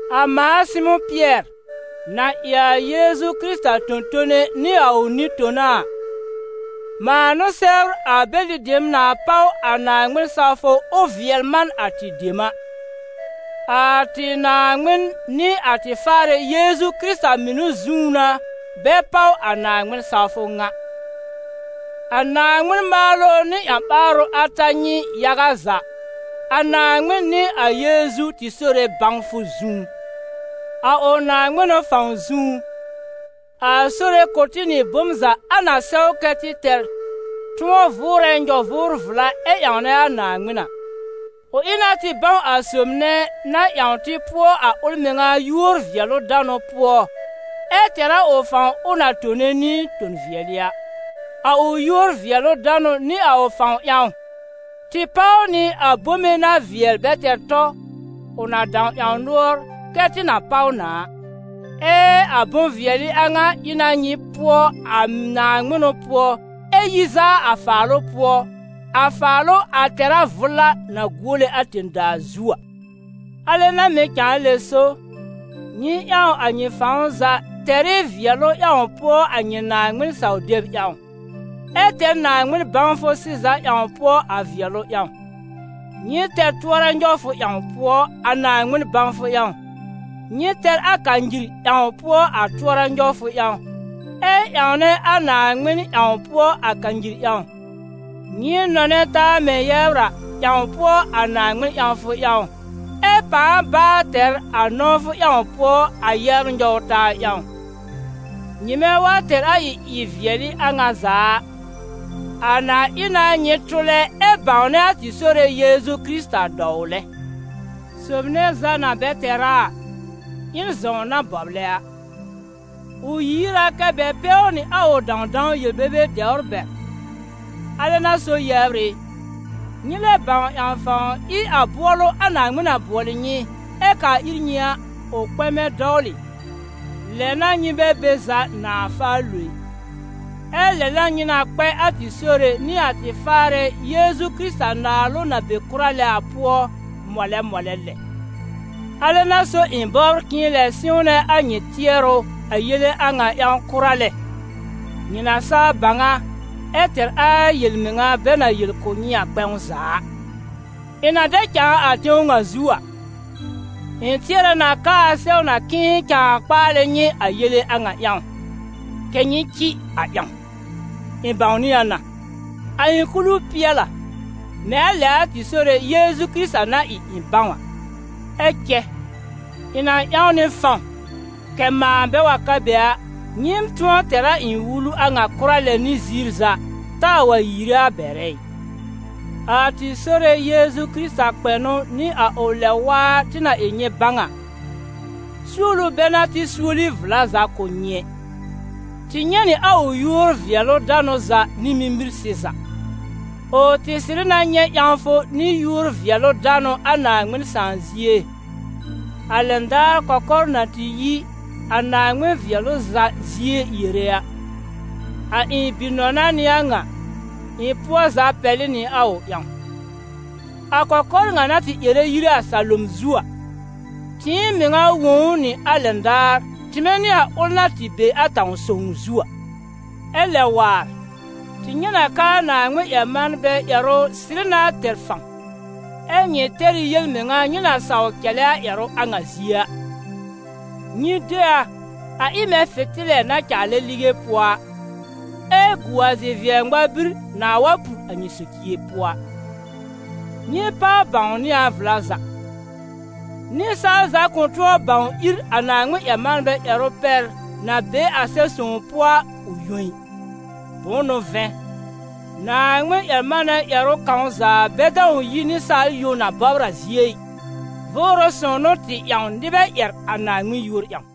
A mãa Sɩmʋ̃ Pɩɛr, na ɩ a Yeezu Kɩrɩta tõ-tone nɩ a ʋ nɩ-tona a, mãa n'ʋ sɛbr a bɛlɩ dem na páw a Naaŋmɩn-sawfʋ ʋ vɩɛl man a tɩ dem a. A tɩ Naaŋmɩn nɩ a tɩ Faarɛ Yeezu Kɩrɩta mɩnʋ zũú n'a bɛ páw a Naaŋmɩn-sawfʋ ŋa. A Naaŋmɩn maalʋ nɩ a ƴã-ɓaarʋ a ta nyɩ yaga za, a Naaŋmɩn nɩ a Yeezu tɩ Sore bãwfʋ zũú. A ʋ naaŋmɩnʋ fãw zũú, a Sore kʋ̀ tɩ nɩ bom za a na sɛw kɛ́ tɩ tɛr tʋ̃ɔ vʋʋrɛ nyɔ-vʋʋr-vla ɛ ƴãwnɛ a Naaŋmɩn a. Ʋ ɩ na tɩ bãw a Sob nɛ na ƴãw tɩ pʋɔ a ʋl mɩŋa yúor-vɩɛlʋ-danʋ pʋɔ, ɛ tɛr a ʋ fãw ʋ na tone nɩ ton-vɩɛlɩ a. A ʋ yúor-vɩɛlʋ-danʋ nɩ a ʋ fãw ƴãw, tɩ páw nɩ a bome na vɩɛl bɛ tɛr tɔ, ʋ na dãw ƴãw nʋɔr kɛ́ tɩ na páw na a. Ɛ a bʋ̃-vɩɛlɩ a ŋa ɩ na nyɩ pʋɔ a naaŋmɩnʋ pʋɔ ɛ yi zaa a faalʋ pʋɔ, a faalʋ a tɛ̀rá vʋla na guole a tẽ-daa zu a. Alɛ n'a mɩ̀ cãa lɛ so, nyɩ ƴãw a nyɩ fãw za tɛr ɩ vɩɛlʋ ƴãw pʋɔ a nyɩ Naaŋmɩn-saw-deb ƴãw, ɛ tɛr Naaŋmɩn bãwfʋ sɩza ƴãw pʋɔ a vɩɛlʋ ƴãw; nyɩ tɛr tʋɔra-nyɔwfʋ ƴãw pʋɔ a Naaŋmɩn bãwfʋ ƴãw, nyɩ tɛr a kanyir ƴãw pʋɔ a tʋɔra-nyɔwfʋ ƴãw, ɛ ƴãwnɛ a Naaŋmɩn ƴãw pʋɔ a kanyir ƴãw; nyɩ nɔnɛ taa mɛ̃ yɛbr a, ƴãw pʋɔ a Naaŋmɩn ƴãwfʋ ƴãw, ɛ pãa baa tɛr a nɔ̃wfʋ ƴãw pʋɔ a yɛbr nɔw-taa ƴãw. Nyɩmɛ wa tɛr a ɩ-vɩɛlɩ a ŋa za a, a na ɩ na nyɩ tʋlɛ ɛ bãwnɛ a tɩ Sore Yeezu Kɩrɩta dɔwlɛ. Sob nɛ za na bɛ tɛr a a, ɩ n zɔ̃w na bɔblɛ a: ʋ yiir a kɛ́ bɛ pɛw nɩ a ʋ dãwdãw yel-bebe dɛwr bɛr. Alɛ n'a so yɛbr ɩ, nyɩ lɛ bãw ƴãw fãw ɩ a bʋɔlʋ a Naaŋmɩn na bʋɔlɩ nyɩ, ɛ kaa ir nyɩ a, ʋ kpɛmɛ dɔwlɩ, lɛ n'a nyɩ bɛ be za nãà faa lo ɩ. Ɛ lɛ n'a nyɩ na kpɛ a tɩ Sore nɩ a tɩ Faarɛ Yeezu Kɩrɩta naalʋ na be kʋra lɛ a pʋɔ, mɔlɛ mɔlɛ lɛ. Alɛ n'a so ɩ̃ bɔbr k'ɩ̃ɩ lɛ sɩ̃wnɛ a nyɩ tɩɛrʋ a yele a ŋa ƴãw kʋra lɛ, nyɩ na saa bãw a, ɛ tɛr a yel-mɩŋa bɛ na yel kʋ̀ nyɩ a kpɛ̃w za a. Ɩ̃ na dɛ cãa a tẽw ŋa zu a, ɩ̃ tɩɛrɛ na k'aa sɛw na k'ɩ̃ɩ cãa kpaalɛ nyɩ a yele a ŋa ƴãw, kɛ̀ nyɩ cɩ a ƴãw. Ɩ̃ bãwnɩ a na, a ɩ̃ kulu pɩɛl a, mɛ̃ a lɛ a tɩ Sore Yeezu Kɩrɩta na ɩ ɩ̃ bãw a. Ɛ cɛ ɩ̃ na ƴãw nɩ fãw kɛ̀ mãa bɛ wa ka be a, nyɩɩm tʋ̃ɔ tɛr a ɩ̃ wulu a ŋa kʋra lɛ nɩ ziir za, taa wa yiire a bɛrɛ ɩ. A tɩ Sore Yeezu Kɩrɩta kpɛnʋ nɩ a ʋ lɛb-waa tɩ na ɩ nyɩ bãw a, suolu bɛ n'a tɩ suoli vla za kʋ̀ nyɩ ɛ. Tɩ nyɛ̃ nɩ a ʋ yúor-vɩɛlʋ-danʋ za nɩ mimir sɩza. Ʋ tɩ sɩrɩ na nyɛ̃ ƴãwfʋ nɩ yúor-vɩɛlʋ-danʋ a Naaŋmɩn Sãà zie, a lɛn daar kɔkɔr na tɩ yi a Naaŋmɩn vɩɛlʋ za zie yere a: «A ɩ̃ bi-nɔna n'ɩ a ŋa, ɩ̃ pʋɔ za pɛlɩ nɩ a ʋ ƴãw.» A kɔkɔr ŋa na tɩ ƴɛrɛ yire a salom zu a, tɩɩm mɩŋa wõ ʋ nɩ a lɛn daar tɩmɛ nɩ a ʋl na tɩ be a tãw sõw zu a. Ɛ lɛ waar, tɩ nyɛ̃ na k'aa Naaŋmɩn-ƴɛr-manbɛ ƴɛrʋ sɩrɩ na tɛr fãw, ɛ́ nyɩ tɛr ɩ yel-mɩŋa nyɩ na saw cɛlɛ a ƴɛrʋ a ŋa zie a. Nyɩ de a, a ɩ mɛ̃ fɩ̃tɩlɛ na caalɛ lige pʋɔ a, ɛ gu a zi-vɩɛ-ŋmar-bir nãà wa pur a nyɩ socie pʋɔ a. Nyɩ páw bãwnɩ a vla za: nɩsaal za kʋ̃ tʋ̃ɔ bãw ír a Naaŋmɩn-ƴɛr-manbɛ ƴɛrʋ pɛr na be a Sɛb-sõw pʋɔ a, ʋ yõ ɩ. Bʋ̃ʋ n'ʋ vɛ̃, Naaŋmɩn-ƴɛr-manɛ ƴɛrʋ kãw za bɛ dãw yi nɩsaal yõ na bɔbr a zie ɩ, Vʋʋrʋ Sõw n'ʋ tɩ ƴãw nɩbɛ ƴɛr a Naaŋmɩn yúor ƴãw.